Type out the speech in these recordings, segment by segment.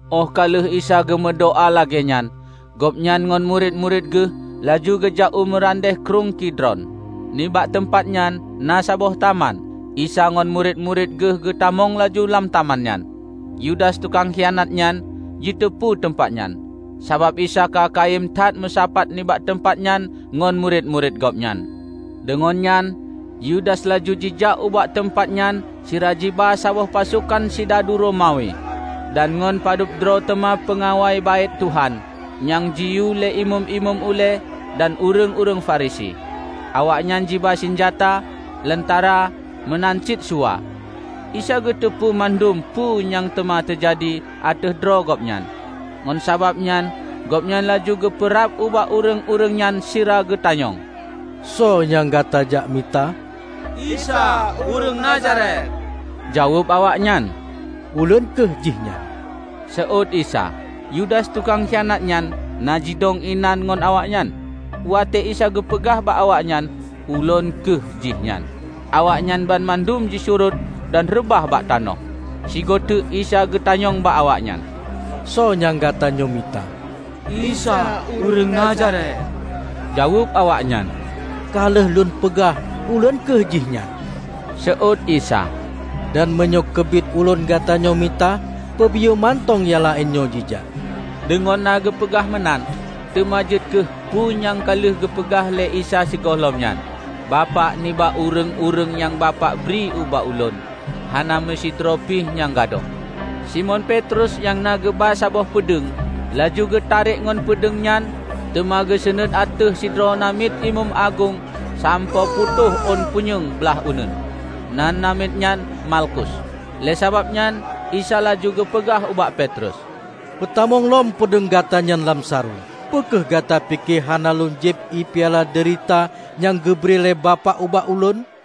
Óh ka lheueh Isa geumeudoá lagée nyan, Gobnyan ngon murit-murit Geuh laju geujak u meurandeh Krueng Kidron. Nibak teumpat nyan na saboh taman, Isa ngon murit-murit Geuh geutamong laju lam taman nyan. Yudas tukang khianat nyan, jiteupeu teumpat nyan; sabab Isa ka kayém that meusapat nibak teumpat nyan ngon murit-murit Gobnyan. Deungon nyan Yudas laju jijak ubak teumpat nyan sira jiba saboh pasokan sidadu Romawi dan ngon padubdroe teuma peungawai Baét Tuhan nyang jiyue lé imeum-imeum ulée dan ureuëng-ureuëng Farisi. Awaknyan jiba sinjata, lentara meunan cit suwa. Isa geuteupeue mandum peue nyang teuma teujadi ateueh droe Gobnyan. Ngon sabab nyan Gobnyan laju geupeurab ubak ureuëng-ureuëng nyan sira geutanyong, "Soe nyang gata jak mita?" "Isa, ureuëng Nazaret," jaweueb awaknyan. "Ulôn kheueh Jihnyan," seuôt Isa. Yudas tukang khianatnyan na jidong inan ngon awaknyan. Watée Isa geupeugah bak awaknyan, "Ulôn kheueh jihnyan," awaknyan banmandum jisurot dan reubah bak tanoh. Sigoe teuk Isa geutanyong bak awaknyan, "Soe nyang gatanyoe mita?" "Isa ureuëng Nazaret," jaweueb awaknyan. "Ka lheueh Lôn peugah, Ulôn kheueh Jihnyan," seuôt Isa. "Dan meunyoe keubiet Ulôn gata nyoe mita, peubiyeu mantong nyang laén nyoe jijak." ( Deungon na geupeugah meunan, teuma jeuet kheueh peue nyang ka lheueh geupeugah lé Isa sigohlom nyan: "Bapak, nibak ureuëng-ureuëng nyang Bapak bri ubak Ulôn, hana meusidroe pi nyang gadôh.") Simon Petrus nyang na geuba saboh peudeueng, laju geutarek ngon peudeueng nyan teuma geuseunuet ateueh sidroe namiet imeum agong sampoe putôh ôn punyueng blaih uneuen. Nan namiet nyan Malkus. Lé sabab nyan Isa laju geupeugah ubak Petrus, "Peutamong lom peudeueng gata nyan lam sarong! Peu kheueh gata pike hana Lôn jieb piala deurita nyang geubri lé Bapak ubak Ulôn?"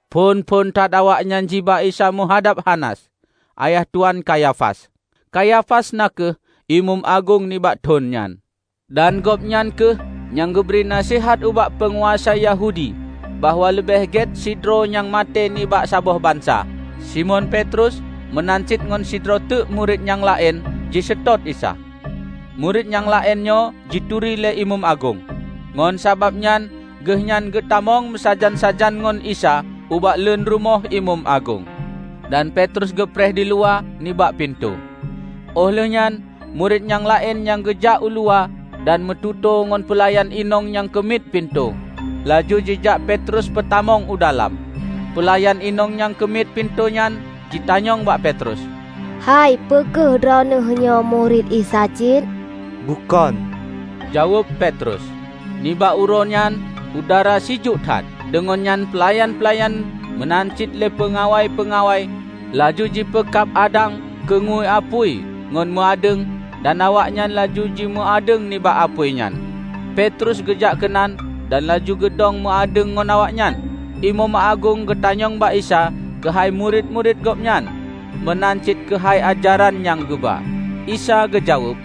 Phon-phon that awaknyan jiba Isa meuhadab Hanas, ayah tuan Kayafas. Kayafas na kheueh imeum agong nibak thon nyan. Dan Gobnyan kheueh nyang geubri naseuhat ubak peunguasa Yahudi bahwa leubeh gét sidroe nyang maté nibak saboh bansa. Simon Petrus meunan cit ngon sidroe teuk murit nyang laén jiseutôt Isa. Murit nyang laén nyoe jituri lé imeum agong; ngon sabab nyan geuhnyan geutamong meusajan-sajan ngon Isa ubak leun rumoh imeum agong, dan Petrus geupreh diluwa, nibak pintoe. Óh lheuehnyan murit nyang laén nyan geujak uluwa dan meututoe ngon peulayan inong nyang keumiet pintoe, laju jijak Petrus peutamong u dalam. Peulayan inong nyang keumiet pintoe nyan jitanyong bak Petrus, "Hai, peu kheueh droeneueh nyoe murit Isa cit?" "Bukon," jaweueb Petrus. Nibak uroenyan udara sijuek that, deungon nyan peulayan-peulayan meunan cit lé peungawai-peungawai laju jipeukab adang keungeue apui ngon meuadeueng, dan awaknyan laju jimeuadeueng nibak apui nyan. Petrus geujak keunan dan laju geudong meuadeueng ngon awaknyan. Imeum agong geutanyong bak Isa keuhai murit-murit Gobnyan meunan cit keuhai ajaran nyang geuba. Isa geujaweueb,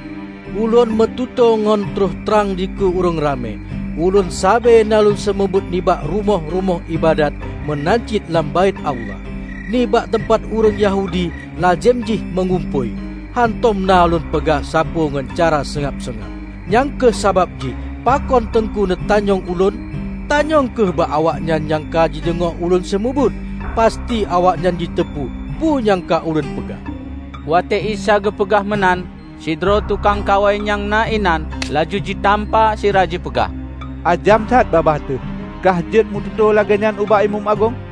"Ulôn meututoe ngon troh trang dikeue ureuëng ramé. Ulôn sabe na Lôn seumeubeuet nibak rumoh-rumoh iébadat meunan cit lam Baét Allah, nibak teumpat ureuëng Yahudi lazem jih meugumpôi. Hántom na Lôn peugah sapeue ngon cara seungab-seungab. Nyang kheueh sabab jih pakon Teungku neutanyong Ulôn? Tanyong kheueh bak awaknyan nyang ka jideungoe Ulôn seumeubeuet. Pasti awaknyan jiteupeu peue nyang ka Ulôn peugah." Watée Isa geupeugah meunan, sidroe tukang kawai nyang na inan laju jitampa sira jipeugah, "Ajam that babah teuh kahjeuet meututoe lagée nyan ubak imeum agong!"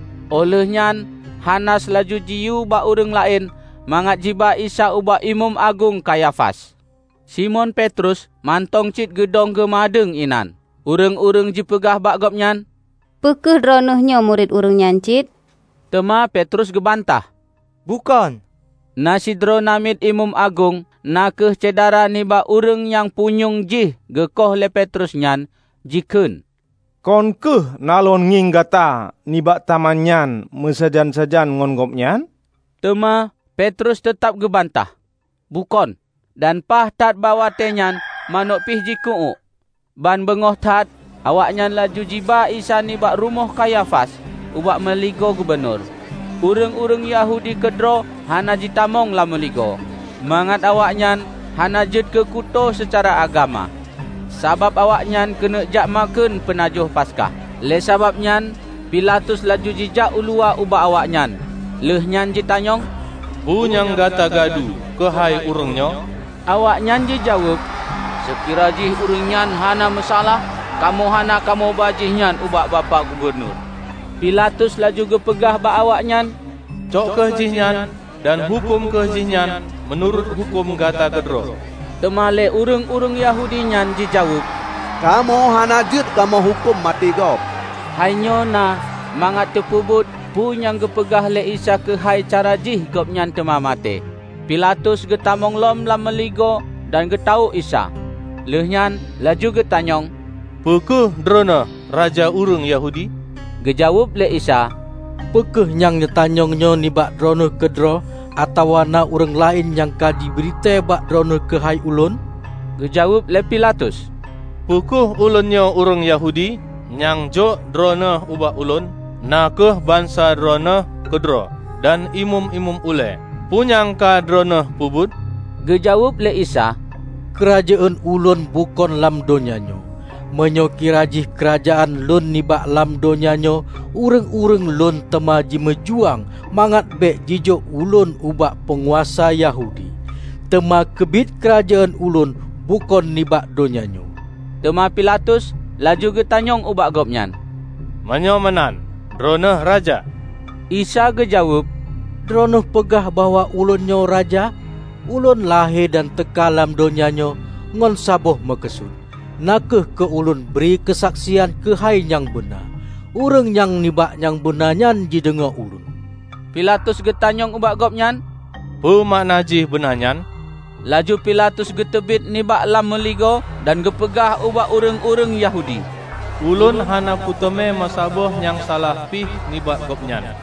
Óh lheuehnyan Hanas laju jiyue bak ureuëng laén mangat jiba Isa ubak Imeum Agong Kayafas. Simon Petrus mantong cit geudong geumeuadeueng inan. Ureuëng-ureuëng jipeugah bak gobnyan, "Peu kheueh droeneueh nyoe murit ureuëng nyan cit?" Teuma Petrus geubantah, "Bukon!" Na sidroe namiet imeum agong, na kheueh syedara nibak ureuëng nyang punyueng jih geukoh lé Petrus nyan, jikheun, "Kon kheueh na lôn ngieng gata nibak taman nyan meusajan-sajan ngon Gobnyan?" Teuma Petrus teutab geubantah, "Bukon," -- dan paih that bak watée nyan manök pi jiku-uék. Ban beungoh that awaknyan laju jiba Isa nibak rumoh Kayafas ubak meuligoe gubunur. Ureuëng-ureuëng Yahudi keudroe hana jitamong lam meuligoe, mangat awaknyan hana jeuet keukuto seucara agama, sabab awaknyan keuneuk jak makheun peunajoh Paskah. Lé sabab nyan Pilatus laju jijak uluwa ubak awaknyan lheueh nyan jitanyong, "Peue nyang gata gadu keuhai ureuëng nyoe?" Awaknyan jijaweueb, "Seukira jih ureuëng nyan hana meusalah, kamoe hana kamoe ba Jihnyan ubak Bapak Gubunur." Pilatus laju geupeugah bak awaknyan, "Cok kheueh jihnyan dan huköm kheueh jihnyan meunurot huköm gata keudroe!" Teuma lé ureuëng-ureuëng Yahudi nyan jijaweueb, "Kamoe hana jeuet kamoe huköm maté gob." ( Hai nyoe na mangat teupeubuet peue nyang geupeugah lé Isa keuhai cara jih Gobnyan teuma maté.) Pilatus geutamong lom lam meuligoe dan geutawök Isa, lheuehnyan laju geutanyong, "Peu kheueh droeneueh Raja ureuëng Yahudi?" Geujaweueb lé Isa, "Peu kheueh nyang neutanyong nyoe nibak droeneueh keudroe atawa na ureuëng laén nyang ka jibri tée bak droeneueh keuhai Ulôn?" Geujaweueb lé Pilatus, "Peu kheueh ulôn nyoe ureuëng Yahudi? Nyang jok Droeneueh ubak ulôn na kheueh bansa Droeneueh keudroe dan imeum-imeum ulée. Peue nyang ka Droeneueh peubuet?" Geujaweueb lé Isa, "Keurajeuen Ulôn bukon lam donya nyoe. Meunyoe kirajih keurajeuen Lôn nibak lam donya nyoe ureuëng-ureuëng Lôn teuma jimeujuang mangat bék jijok Ulôn ubak peunguasa Yahudi. Teuma keubiet keurajeuen Ulôn bukon nibak donya nyoe!" Teuma Pilatus laju geutanyong ubak Gobnyan, "Meunyoe meunan, Droeneueh raja?" Isa geujaweueb, "Droeneueh peugah bahwa Ulôn nyoe raja. Ulôn lahé dan teuka lam donya nyoe ngon saboh meukeusut, na kheueh keu Lôn bri keusaksian keuhai nyang beuna. Ureuëng nyang nibak nyang beuna nyan jideungoe Ulôn." Pilatus geutanyong ubak Gobnyan, "Peue makna jih beuna nyan?" Laju Pilatus geuteubiet nibak lam meuligoe dan geupeugah ubak ureuëng-ureuëng Yahudi, "Ulôn hana kuteumé meusaboh nyang salah pih nibak Gobnyan.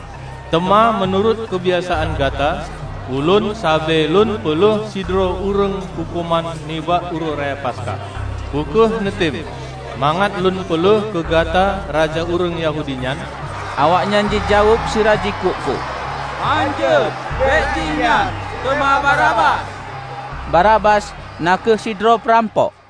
Teuma meunurot keubiasaan gata, ulôn sabe lôn peulheueh sidroe ureuëng huköman nibak Uroe Raya Paskah. Peu kheueh neutem mangat lôn peulheueh keu gata raja ureuëng Yahudi nyan?" Awaknyan jijaweueb sira jikuk-kuk, "Hánjeuet, bék Jihnyan, teuma Barabas!" (Barabas na kheueh sidroe peurampok.)